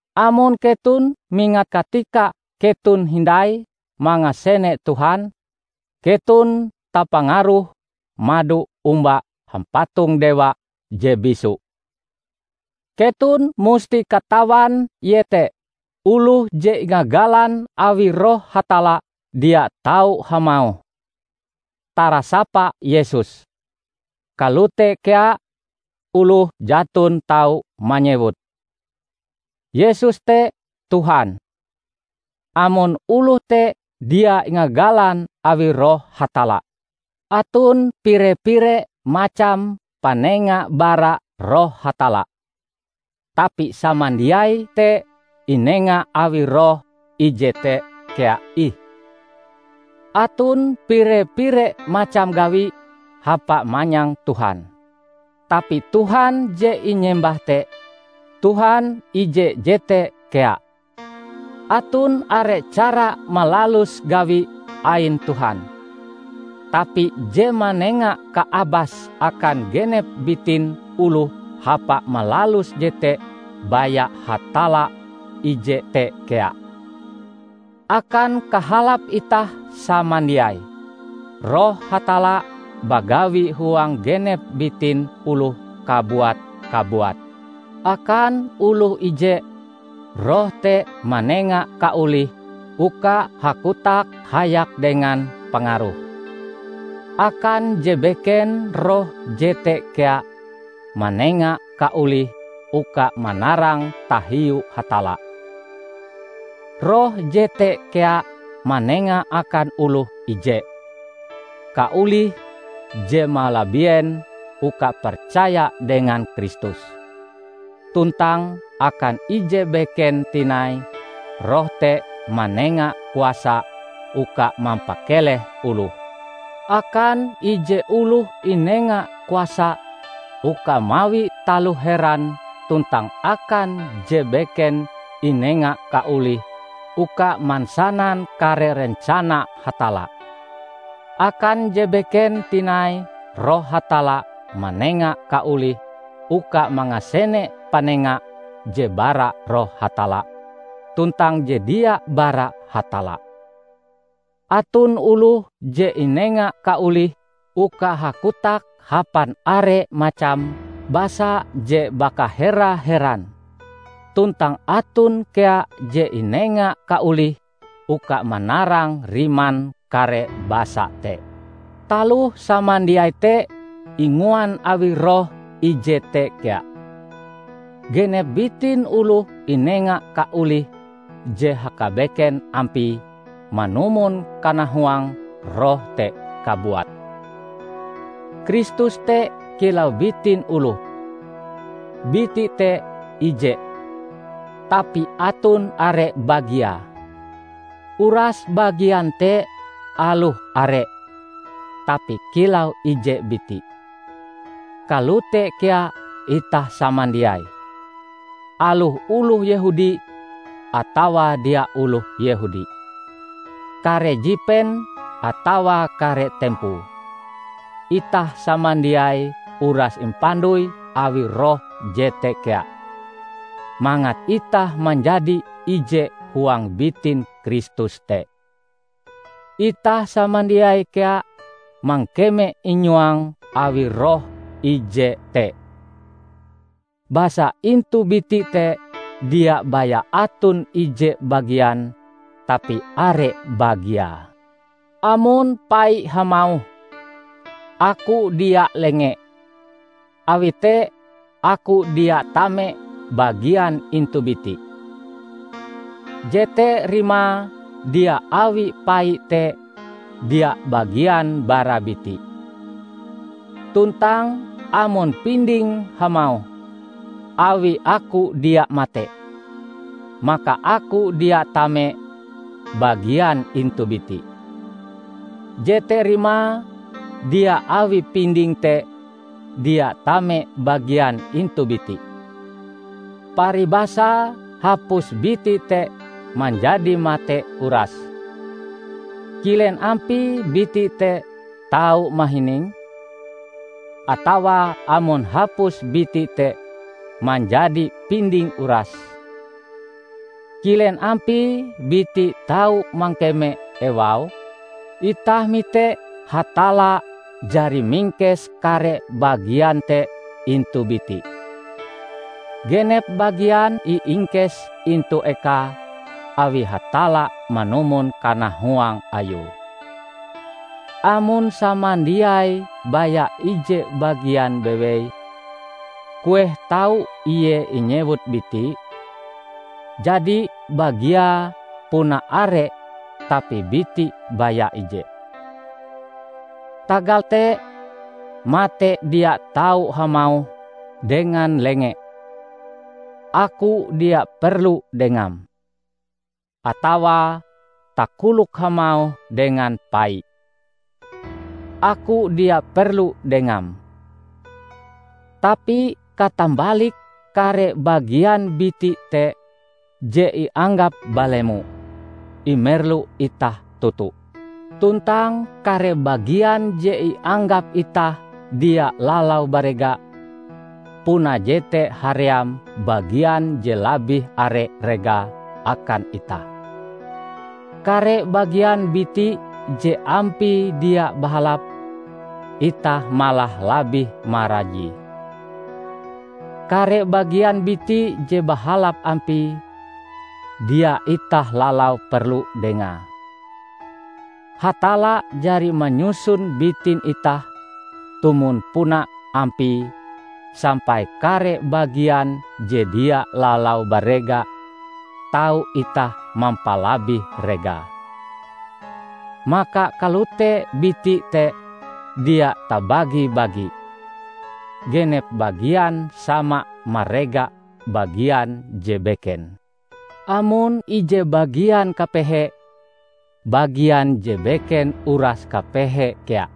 Amon keton mingat katika keton hindai mangasene Tuhan, keton tapangaruh mado omba hampatong dewa je bisu. Keton musti katawan iete oloh je ingagalan awi Roh Hatalla dia tau hamauh, "Tarasapa Yesus!" Kalote kea oloh jaton tau manyewut, "Yesus te Tuhan!" amon oloh te dia ingagalan awi Roh Hatalla. Aton pire-pire macam panenga bara Roh Hatalla, tapi samandiai te inenga awi Roh ije te kea ih. Aton pire-pire macam gawi hapa manyang Tuhan, tapi Tuhan je inyembah te, Tuhan ije jete kea! Aton are cara malalus gawi ain Tuhan, tapi je manenga kaabas akan genep bitin oloh hapa malalus jete baya Hatalla ije te kea. Akan kahalap itah samandiai, Roh Hatalla bagawi huang genep bitin oloh kabuat-kabuat. Akan oloh ije, Roh te manenga kaolih uka hakotak hayak dengan pangaruhe. Akan je beken Roh jete kea manenga kaolih uka manarang tahiu Hatalla. Roh jete kea manenga akan oloh ije, kaolih je malabien uka percaya dengan Kristus; tuntang akan ije beken tinai Roh te manenga kuasa uka mampakeleh oloh. Akan ije oloh inenga kuasa uka mawi taloh heran tuntang akan je beken inenga kaolih uka mansanan kare rencana Hatalla. Akan je beken tinai Roh Hatalla manenga kaolih uka mangasene panenga je bara Roh Hatalla tuntang je dia bara Hatalla. Aton oloh je inenga kaolih uka hakotak hapan are macam basa je bakahera-heran, tuntang aton kea je inenga kaolih uka manarang riman kare basa te. Taloh samandiai te inguan awi Roh ije te kea; genep bitin oloh inenga kaolih je hakabeken ampie manumon kanahuang Roh te kabuat. Kristus te kilau bitin oloh; biti te ije, tapi aton are bagiae. Uras bagian te, aloh are, tapi kilau ije biti. Kalote kea itah samandiai, aloh oloh Yehudi atawa dia oloh Yehudi, kare jipen atawa kare tempoe; itah samandiai uras impandoi awi Roh jete kea, mangat itah manjadi ije huang bitin Kristus te. Itah samandiai kea mangkeme inyuang awi Roh ije te. Basa intu biti te dia baya aton ije bagian tapi are bagiae. Amon pai hamauh, "Aku dia lenge, awi te aku dia tame bagian intu biti," jete rimae dia awi pai te dia bagian bara biti. Tuntang amon pinding hamauh, "Awi aku dia mate, maka aku dia tame bagian intu biti," jete rimae dia awi pinding te dia tame bagian intu biti. Paribasae hapus biti te manjadi mate urase, kilen ampie biti te tau mahining? Atawa amon hapus biti te manjadi pinding urase, kilen ampie biti tau mangkeme ewau? Itah mite Hatalla jari mingkes kare bagian te intu biti. Genep bagian iingkes intu ekae awi Hatalla manumon kanahuang Ayue. Amon samandiaie baya ije bagian bewei, kueh tau ie inyewut biti? Jadi bagiae puna are tapi biti baya ije. Tagal te, mate dia tau hamauh dengan lenge, "Aku dia perlu dengam!" atawa takolok hamauh dengan pai, "Aku dia perlu dengam!" Tapi katambalike kare bagian biti te je ianggap balemo, imerlu itah toto; tuntang kare bagian je ianggap itah dia lalau barega, puna jete haream bagian je labih are regae akan itah. Kare bagian biti je ampie dia bahalap, itah malah labih marajie. Kare bagian biti je bahalap ampie, dia itah lalau perlu dengae. Hatalla jari manyusun bitin itah tumon puna ampie sampai kare bagian je dia lalau barega tau itah mampalabih regae. Maka kalote biti te dia tabagi-bagi; genep bagian sama marega bagian je beken. Amon ije bagian kapehe, bagian je beken uras kapehe kea;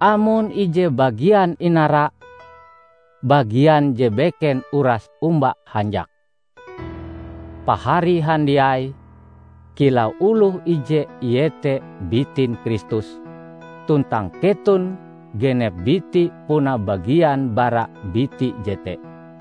amon ije bagian inara, bagian je beken uras omba hanjak. Pahari handiai kilau oloh ije iete bitin Kristus tuntang keton genep biti puna bagian bara biti jete.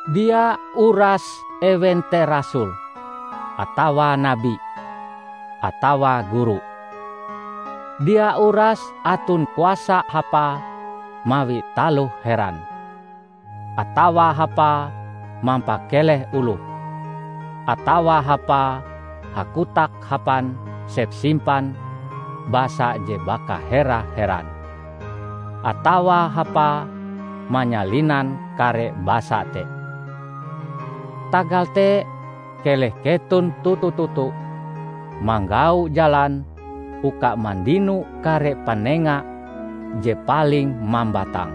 Dia urase ewen te rasul, atawa nabi, atawa guru. Dia urase aton kuasa hapae mawi taloh heran, atawa hapae mampakeleh oloh, atawa hapae hakotak hapan sepsimpan basa je bakahera-heran, atawa hapae manyalinan kare basa te. Tagal te, keleh keton toto-toto manggau jalan uka mandino kare panenga je paling mambatang.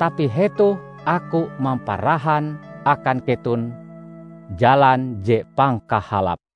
Tapi hetoh aku mamparahan akan keton jalan je pangkahalape.